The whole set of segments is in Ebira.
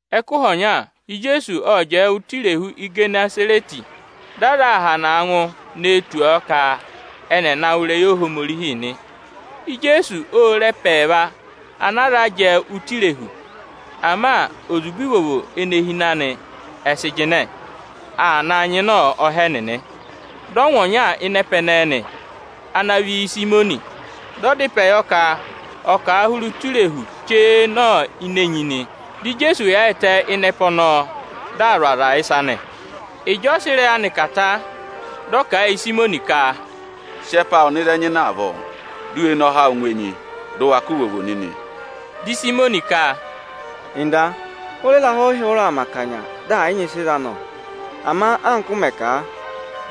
Ẹkụhị ọnya, Ijeesu ộ jẹẹ ụtọ Irehu Igenesarẹtị, dị aza aa hanaa ngụ nee tù ọ ka ẹnị ẹ̀ na wụ́ ịrẹyị Ohomorihi nị. Ijeesu ô re ẹpa ẹẹva anaa za jẹẹ ụtọ irehu, ama ozube ivovo ene hi ịnị anị, ẹ sị jịnẹ aa na nyịna ọha ẹnịnị. Dị ọ ngụ ọnya ịnị ẹpa ẹnẹẹ nị, ana vị Ịsayịmọnị. Dị ọ dá ịpẹ yọ ka ọ̀ kà a hụrẹ ụtọ irehu chee nọ ini enyi nị. Dị Ijeesu yaayịtẹ ịnị ẹpa ọnọọ, di aa zụ̀ aza ịsa nị. Ịjị ọ sị ịrẹyị anị kà ta, dị ọ kà a yị Ịsayịmọnị ka, “Sị ẹpa awụ nọ ịzị ẹ nyịnẹ avọọ, di u we ne ọha awụ ngụ enyi, ka u vee re ivovoo za nịnị!” Dị Ịsayịmọnị ka, “Nda, hụrẹ ịrahụ ị hụrẹ aa mẹ akanya, dị ẹ̀ yị nyị ịsị ị za nọ! Ama anka ụ mẹ̀ kà a,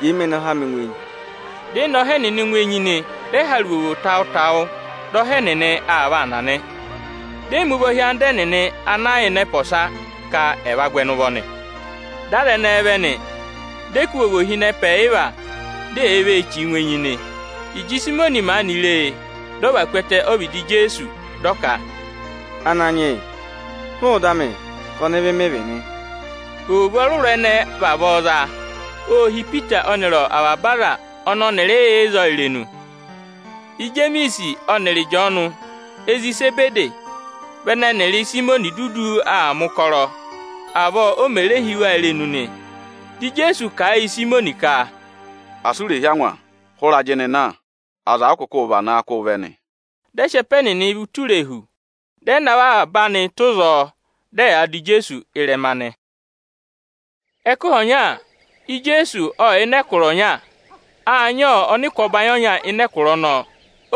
jẹẹ me ne ọha amị ngụ enyi.” Ẹnịnị ê ne ọha ẹnịnị ngụ enyi, dị ẹ hara ivovo tawụ-tawụ, dị ọha ẹnịnị aa vaa na nị. Di e mi ụvọ hị́ anda ẹnịnị ana yà ịnị ẹpa ọsa, ka ẹ̀ va gụ ẹnị ụvọ nị. Dị aza ẹnẹẹ vẹ nị, dị ẹ kụ́ ivovo hi ịnị ẹpa ẹyịva, di eyee vee chìi ngụ enyi nị. Ịjị Ịsayịmọnị maanị re e, dị ọ và ku ẹtẹ ọ́vịdị Ijeesu, dị ọ ka, “Ananyị yị, hụụ ịda amị, ka ọnịvị mị vị nị!” Ivovo ọrụrụ ẹnẹ ẹ vavọọ za, ô hí Ipita ọnịrị avaba aza ọnị ọnịrịị yà ịzọọ irenu. Ijemiisi ọnịrị Ịjọọnụ, ezi Isebede, vị ẹnẹ ẹnịrị Ịsayịmọnị dudu aa mẹ̀ ụkọrọ. Avọọ o mè re hí ẹnị irenu nị. Dị Ijeesu kà a yị Ịsayịmọnị ka, “Asị u rè hí angwa, hụrẹ ajịnị na, aza ụ kụkụ vanaa kụ́ụ vẹ nị!” Dị ẹ sị ẹpa ẹnịnị vẹ ụtọ irehu, dị ẹ navọ avaba anị tụ́ ịzọọ, dị ẹyaa dụ Ijeesu ịrẹma nị. Ẹkụhị ọnya, Ijeesu ộ yà ịnị ẹkụra ọnya; â nyị ọnịkụ ọbanyị ọnya ịnị ẹkụra ọnọọ.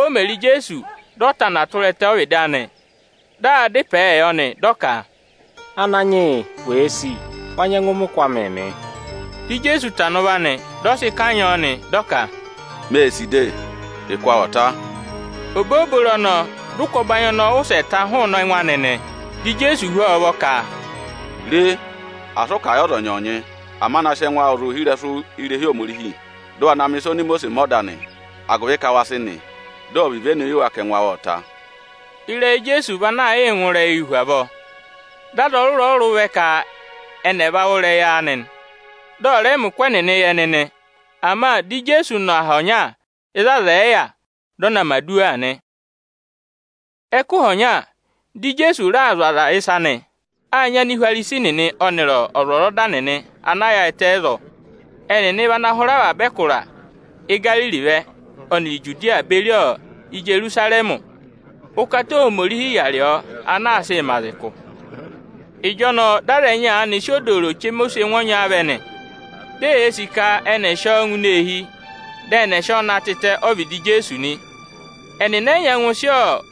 O mè re Ijeesu, dị ọ tana tụra ẹtẹ ọ́vịdị anị, dị aa dá ịpẹẹ yọ nị. Dị ọ ka, “Ananyị yị, wèe sì, wa nyẹngụ mẹ ụkụ amịị mị.” Dị Ijeesu tana ụvọ anị, dị ọ sị kanyị ọọ nị, dị ọ ka, “Mee sì de, ụkụ awụ ọ̀ ta!” Obooboro ọnọọ, dị ụkụ ọbanyị ọnọọ wụsẹ ta hụụnị ẹngụ anị nị. Dị Ijeesu hú ọ ụvọ ka, “Re, asị ụ kà a yị ọza ọnyọọnyị, ama na sị ẹngụ awụ zụ̀ ohirẹsụ irehi Ohomorihi; dị ụ wa na mẹ̀ ịsa oni Imosiisi mẹ ọda anị, agụvị ka wa sị nị, dị ọ̀ vị ivenu yị wa ka ẹngụ awụ ộ ta.” Ịrẹyị Ijeesu vị anaa yịị ngụ ịrẹyịị hu avọọ. Dị aza ọrụrụ-ọrụrụ vẹ ka ẹnị ẹ̀ va wụ́ ịrẹyị anị, dị ọ̀ rẹ mẹ ụkụ ẹnịnị yị ẹnị nị. Ama dị Ijeesu nọ aha ọnya ịzị aza ẹ̀ yị yà, dị ọ na mẹ̀ aduwa nị. Ẹkụhị ọnya, dị Ijeesu raa zụ̀ aza ịsa nị. Â nyị Anihwarisi nịnị ọnịrị ọzwọzọda nịnị ana yaayịtẹ ịzọọ. Ẹnịnị vị ana hụrẹ avaba ẹkụra Igariri vẹ, ọnịrị Ijudiya beri Ijerusarẹmị. Ụkata Ohomorihi yà rị ọọ ana aa sịị mẹ aza ụkụ. Ịjọnọọ dị aza ẹnyị aanị sị odooro chema oswẹngụ ọnya vẹ nị. Di eyee sì ka ẹnị ẹ̀ sị ọọ ngụ eehi, dị ẹnị ẹ̀ sị ọ na tịtẹ ọ́vịdị Ijeesu nị. Ẹnịnị ẹ yị nyẹngụ sị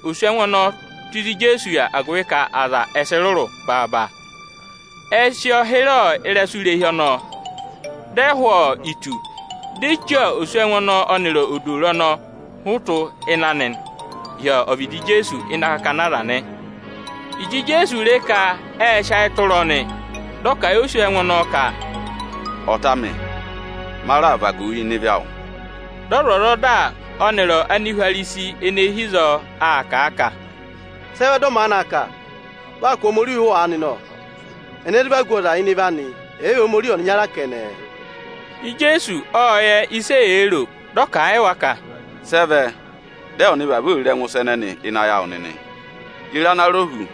oswẹngụ ọnọọ tù ịzị Ijeesu yà, agụvị ka aza ẹ sị rụrụ baaba. Ệ sị ọọ hịrẹ ịrẹsụ irehi ọnọọ, dị ẹ hụ̀ itu, di e chí oswẹngụ ọnọọ ọnịrị odooro ọnị ọ hụtụ ịnị anị, hi ọvịdị Ijeesu ịnị akakana aza nị. Ịjị Ijeesu re ka ệ sị ayị tụra ọnị, dị ọ kà a yị oswẹngụ ọnọọ ka, “Ọta amị, ma raà vagu wu ịnị ịvị awụ.” Dị ọzwọzọda ọnịrị Anihwarisi ene hi ịzọọ aa kà a ka, “Sị ẹ vẹ dị ọ maanị aa kà? Vị aa kụ̀ Ohomorihi ụhụ aanị nọ! Ẹnẹ zụ vagu ọza ịnị ịvị anị, ẹ̀ yị vị Ohomorihi ọnịnya kẹnẹ?” Ijeesu ộ yẹ ịsị eyee ro, dị ọ kà a yị wa ka, “Sị ẹ vẹ dị ụ vavọọ ee ro ẹngụ ịsa ẹnịnị ịnị ayị awụ nịnị? Ye re ana rọ hu,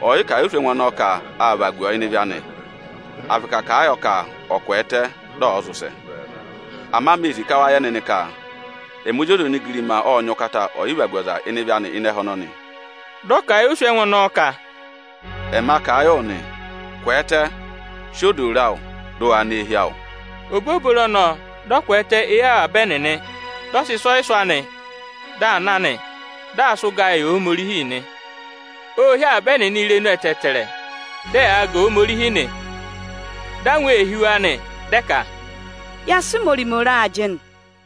ọyịkà yị oswẹngụ ọnọọ ka â vagu ọ ịnị ịvị anị, à vị ka à kà a yọ ka ọ̀ kwẹẹtẹ, dị ọ̀ọ zị ụsẹ? Ama mee sì ka wa yẹ nịnị ka ẹmị Ozi ọza onigirima ộ nyị ụkata ọyịvagu ọza ịnị ịvị anị ịnị ẹhẹ ọnọnị.” Dị ọ kà a yị oswẹngụ ọnọọ ka, “Ẹma kà a yị wụ nị, kwẹẹtẹ, sị odooro awụ, dị ụ waa nọ eehi awụ!” Obooboro ọnọọ, dị ọ kwẹẹtẹ éyi avaba ẹnịnị, dị ọ sị ịsị ọ vịdị sị hụtụ, dị aa na nị. Dị aa sị ụgaa yị Ohomorihi nị. Ô hí avaba ẹnịnị irenu ẹtẹẹtẹrẹ, dị ẹyaa ga Ohomorihi nị; dị angwa ee hí wa nị, dị ẹ ka, “Ya sị ịmọrịmọ re ajịnị.”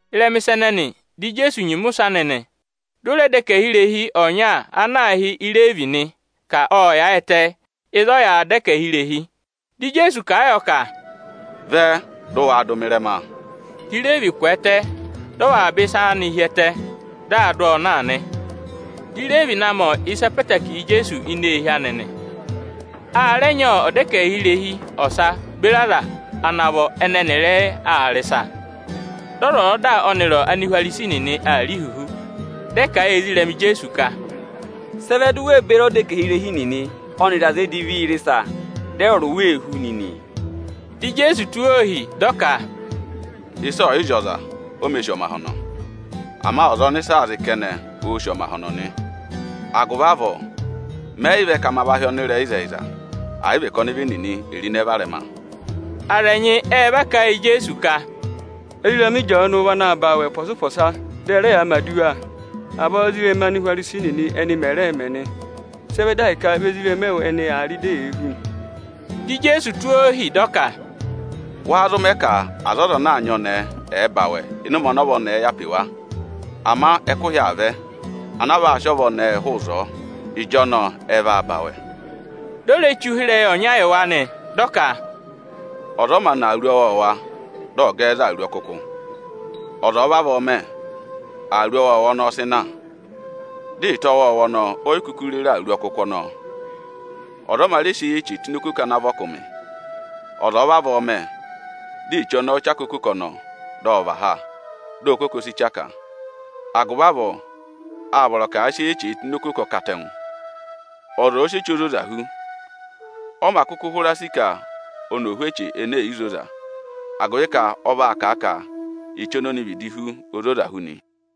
Ịrẹma ịsa ẹnẹnị, dị Ijeesu nyima ụsẹ anị nị. Ô re ọdẹkẹhirehi ọnya ana aā hị́ Ireevi, ka ộ yaayịtẹ ịzị a yàā dọ ẹkẹhị irehi. Dị Ijeesu kà a yọ ka, “Vẹ, dị ụ waa dụ mị ịrẹma!” Di Ireevi kwẹẹtẹ, dị ọ và avaba ịsa anị hi ẹtẹ, dị aa dụ ọọ na nị. Di Ireevi na mẹ̀ ịsa ọkụmị-ọkụmị yị Ijeesu ini eehi anị nị. A rẹ nyị ọdẹkẹhirehi ọsa beri aza ana vọ ẹnẹ ẹnịrịị aa rị ịsa. Dị ọzwọzọda ọnịrị Anihwarisi nịnị aa rị ihuhu, dị ẹ kà a yị ezirẹma Ijeesu ka, “Sị ẹ vẹ di u wee beri ọdẹkẹhirehi nịnị ọnịrị aza edivii rị ịsa, dị ẹwụrị wa ee hú nịnị?” Dị Ijeesu tụ́ wa ohi, dị ọ ka, “Ịsa ọ̀ yị zị ọza, o mē sì ọmahọnọ. Ama ọza ọnị ịsa aa zị kẹnẹ, oō sì ọmahọnọ nị. Agụvị avọọ, mẹ yị vẹ ka ma hị́ ọnịrẹyịzẹyịza, ama mâ vẹ ka ma va hị́ ọnịvị nịnị ka è ro ịnẹ varẹma.” Aza ẹnyị ẹ va ka ẹ yị Ijeesu ka, “Ezirẹma Ịjọọnụ vị anaā ba awẹ ụpọsa-ụpọsa, dị ẹ rẹ yaa mẹ̀ aduwa, avọọ ézirẹma Anihwarisi nịnị ẹnị mẹ̀ rẹẹ̄ mẹ nị. Sị ẹ vẹ di ahịka vị ezirẹma ẹwụ ẹnị aa rị, di eyee hú pooro kẹnẹ nị?” Dị Ijeesu tụ́ ohi dị ọ ka, “Wáá zụ mẹ ka aza ọza ana aa nyị ọnẹẹ, ẹ̀ẹ ba awẹ ịnị ụmẹ ọnị ọva ọnẹẹ yà pe wa? Ama ẹkụhị aa vẹ ana a vaa sị ọva ọnẹẹ hụụ ịzọọ, ịjọnọọ ẹ vaa ba awẹ.” Di o re che ụhịrẹyị ọnya yị wa nị. Ọ kà, “Ọza ọ mā nà awuru ọwọọwa, dị ọ̀ gẹ ẹ za awuru ọkụkụ. Ọza ọ̀ọ vavọọ mẹ, ọ sị awuru ọwọọwa ọnọọ na, dị ịta ọwọọwa ọnọọ o yi re ve rere awuru ọkụkụ ọnọọ. Ọza ọ mā rẹ sị eyi-eche tụ́ ini okoko ana vị ọkụmị. Ọza ọ̀ọ vavọọ mẹ, di eche ọnọọ chaka okoko ọnọọ, dị ọ và ha, di okoko si du ha. Agụvị avọọ â vọrọ ka à sị eyi-eche tụ́ ini okoko ọkatẹngụ. Ọza ọ̀ọ sị eche ozoza hú, ọ mā kụkụ hụra sì ka oni ò hú eche ene è yi zoza. Agụvị ka vị́ ọ vaa kà a ka eche oni oni vịdị hú, o zoza hu nị.”